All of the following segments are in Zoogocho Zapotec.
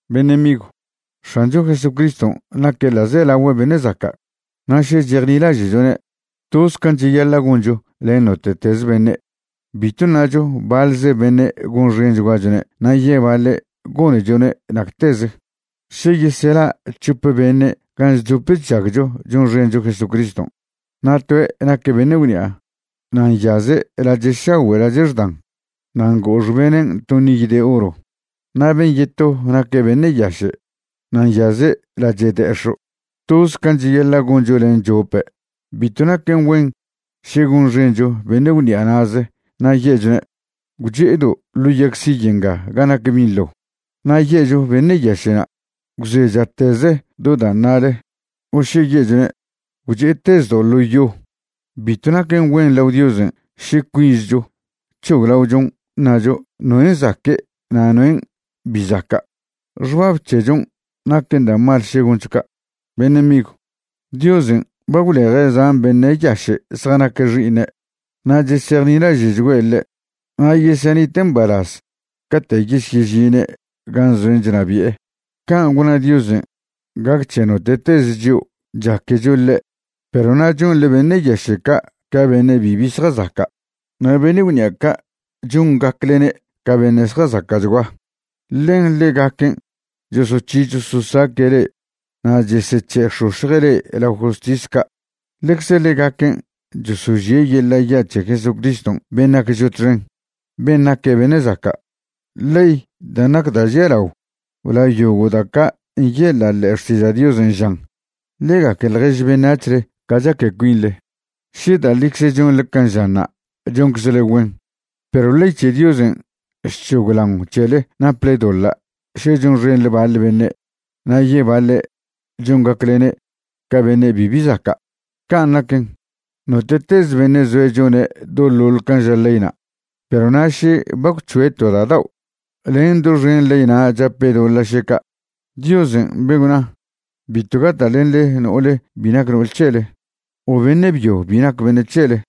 Beṉe' migw, X̱ancho Jesucriston' naque' ḻa'zelagüe beṉe' zaca', na' še chejnilaže'chone', toze can' cheyaḻa' goncho len note'teze beṉe', bitw ṉacho baḻze beṉe' gonxenchguachone' na' yebaḻe' gonechone' nacteze. Še yesela' c̱hope beṉe' gan' chdop chžagcho chonxencho Jesucriston', na' toe' naque' beṉe' gwṉi'a na' nyaze' lache' šagüe' lache' xdan, na' ngo'o xbenen' to niy de oro, na' ben' yeto naque' beṉe' yaše' na' nyaze' lache' de'ex̱o', toze can' cheyaḻa' goncho len chope'. Bitw naquen güen še gonxencho beṉe' gwṉi'a na'ze na' ye'chone': “Gwche'edo' ḻo yag siy nga ga nac binḻo”, na' ye'cho beṉe' yaše'na': “Gwzechateze do dan' na'le”, o še ye'chone': “Gwche'etezdo' ḻo yo”. Bitw naquen güen lao Diosen' še cuinzcho c̱hoglaochon ṉacho noen' zaque' na' noen' bi zaca'. Xbab c̱hechon' naquen da' mal še goncho ca'. Beṉe' migw, Diosen' ba gwleje' zan beṉe' yaše' zjanaque' xi'iṉe' na' chesejnilaže'chgüe' ḻe'. Na' yesenite' mbalaz cate' yesyežine' gan' zoen' chnabi'e, can' gwna Diosen' gac c̱he note'teze chio' chaquecho ḻe'. Perw na' chonḻe beṉe' yaše' ca' ca beṉe' bibi zjazaca'. Na' beṉe' gwṉi'a ca' chongaclene' ca beṉe' zjazaca'chgua; ḻen ḻegaquen' chosoc̱hi chososaque' le'e na' chesec̱he'x̱ox̱je' le'e lao justis ca'. Ḻecze ḻegaquen' chosožie' yeḻa' ya' c̱he Jesucriston' ben' naccho txen, ben' naque' beṉe' zaca'. Ley dan' nac da' žialao lao yogo' da' ca' nyeḻa' ḻe'e Xtiža' Diosen' žan: “Ḻe gaque ḻjež beṉac̱hle ca chaque cuinḻe.” Še da' ḻicze chonḻe can' žanṉa' chonczle güen. Perw ley c̱he Diosen' chc̱hoglaon c̱hele naple doḻa' še chonxenḻe baḻ beṉe' na' yebaḻe' chongaclene' ca beṉe' bibi zaca'. Can' naquen, note'teze beṉe' zoe' chone' doḻoḻ can' ža leyna', perw na' še ba gwc̱hoe' to da' dao', len doxen leyna' chape' doḻa' še ca'. Diosen' ben' gwna: “Bitw gata'lenḻe no'ole bi nac no'ol c̱hele o beṉe' byo bi nac beṉe' c̱hele”,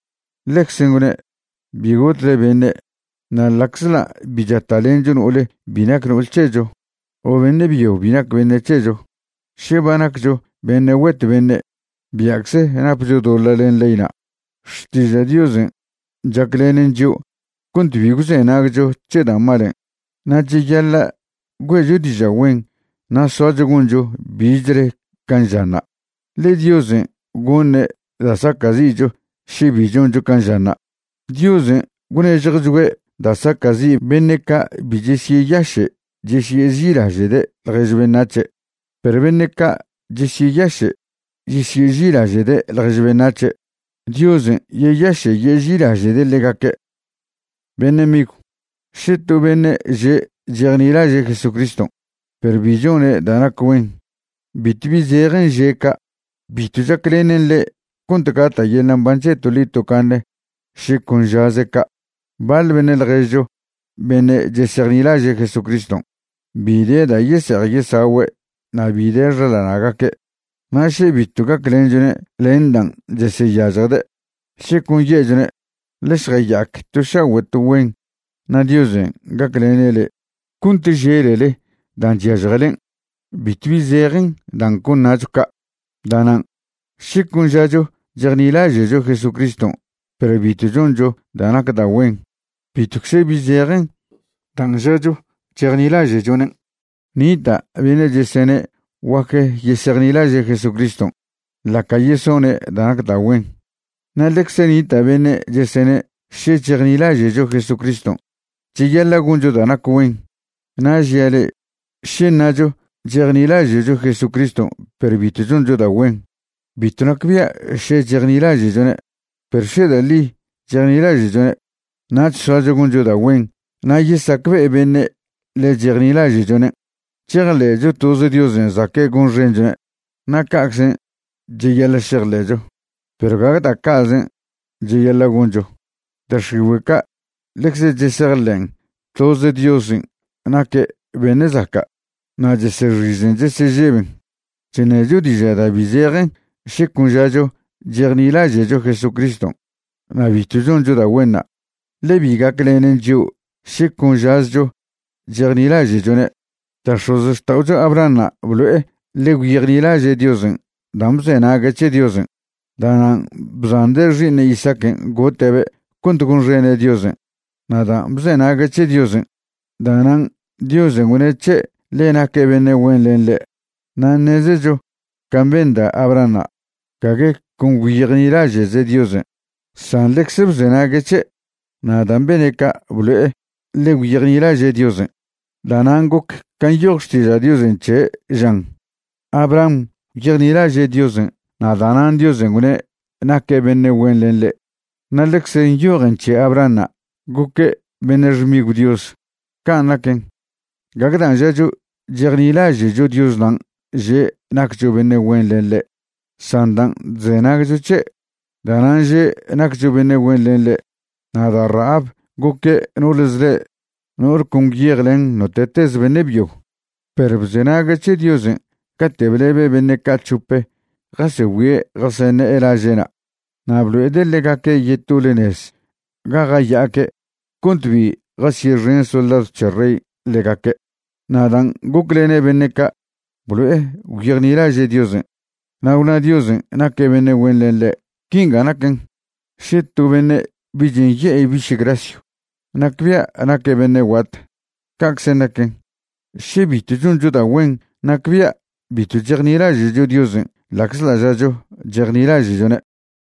ḻeczen' gwne': “Bi gotle beṉe'”. Na' ḻa'czḻa' bitw chata'lencho no'ole bi nac no'ol c̱hecho o beṉe' byo bi nac beṉe' c̱hecho, še ba naccho beṉe' güet beṉe', bia'cze napcho doḻa' len leyna'. Xtiža' Diosen' chaclenen chio' cont bi gwzenagcho c̱he da' malen'. Na' cheyaḻa' güe'cho diža' güen na' soacho goncho bichle can' žanṉa', ḻe Diosen' goṉe' da' saca'zi'cho še bi choncho can' žanṉa'. Diosen' gwnežjwchgüe' da' saca'zi' beṉe' ca' bi chesyeyaše' chesyeži'ilaže'de' ḻjež beṉac̱he'. Perw beṉe' ca' chesyeyaše' chesyeži'ilaže'de' ḻjež beṉac̱he', Diosen' yeyaše' yeži'ilaže'de' ḻegaque'. Beṉe' migw, še to beṉe' že' chejnilaže' Jesucriston' perw bi chone' da' nac güen, bitwbi zejen že' ca'. Bitw chaclenen ḻe' cont gata' yeḻa' mban c̱he' toḻi tocaṉe še con žaze' ca'. Baḻ beṉe' ḻježcho beṉe' chesejnilaže' Jesucriston' bi de da' yese'ej yesagüe' na' bi de xaḻana'gaque'. Na' še bitw gaclenchone' len dan' cheseyažjde', še con ye'chone': “Ḻe šjaya'ac to šagüe' to güen na' Diosen' gaclene' le'e cont želele dan' chyažjelen'”, bitwbi zejen dan' con ṉacho ca'. Da'nan', še con žacho chejnilaže'cho Jesucriston' perw bitw choncho da' nac da' güen, bitwcze bi zejen dan' žacho chejnilaže'chonen'. Nita' beṉe' chesene' guac yesejnilaže' Jesucriston' ḻa ca yesone' da' nac da' güen. Na' ḻecze nita' beṉe' chesene' še chejnilaže'cho Jesucriston' cheyaḻa' goncho da' nac güen. Na' žia' le'e, še ṉacho chejnilaže'cho Jesucriston' perw bitw choncho da' güen, bitw nacbia' še chejnilaže'chone'. Perw še da' ḻi chejnilaže'chone' nach soacho goncho da' güen na' yesacbe'e beṉe' ḻe chejnilaže'chonen'. Chejḻe'cho toze Diosen' zaque' gonxenchone', na' ca'czen' cheyaḻa' šejḻe'cho. Perw gague da' ca'zen' cheyaḻa' goncho. Da' x̱igüe' ca' ḻecze chesejḻen' toze Diosen' naque' beṉe' zaca' na' chesexizen chesežeben. Chṉecho diža' da' bi zejen še con žacho chejnilaže'cho Jesucriston' na' bitw choncho da' güenṉa', ḻe bi gaclenen chio' še con žazcho chejnilaže'chone'. Da' x̱ozxta'ocho Abrahanṉa' blo'e ḻe gwyejnilaže' Diosen' dan' bzenague' c̱he Diosen'. Da'nan' bzande' xi'iṉe' Isaaquen' gote'be' cont gonxene' Diosen'. Na' dan' bzenague' c̱he Diosen', da'nan' Diosen' gwne' c̱he' ḻe naque' beṉe' güen len ḻe'. Na' ṉezecho can' ben da' Abrahanṉa', gague con gwyejnilaže'ze Diosen', san ḻecze bzenague' c̱he'. Na' dan' bene' ca' blo'e ḻe gwyejnilaže' Diosen'. Da'nan' goc can' nyoj Xtiža' Diosen' c̱he', žan: “Abraham gwyejnilaže' Diosen' na' da'nan' Diosen' gwne' naque' beṉe' güen len ḻe'.” Na' ḻecze nyojen c̱he Abrahanṉa' goque' beṉe' xmigw Dios. Can' naquen, gague dan' žacho chejnilaže'cho Dios nan' že' naccho beṉe' güen len ḻe', san dan' chzenagcho c̱he', da'nan' že' naccho beṉe' güen len ḻe'. Na' da' Rahab goque' no'ole zḻe' no'ol con gwyej len note'teze beṉe' byo, perw bzenague' c̱he Diosen' cate' blebe' beṉe' ca' c̱hope jasegüia jaseṉe'e laže'na'. Na' blo'ede' ḻegaque' yetole nez ga jaya'aque' cont bi jasyexen soldadw c̱he rey ḻegaque'. Na' dan' goclene' beṉe' ca', blo'e gwyejnilaže' Diosen'. Na' gwna Diosen' naque' beṉe' güen len ḻe'. Quinga naquen: Še to beṉe' bich nye'e biš grasyw, nacbia' naque' beṉe' guat. Ca'czen' naquen, še bitw choncho da' güen nacbia' bitw chejnilaže'cho Diosen' ḻa'czḻa' žacho chejnilaže'chone'.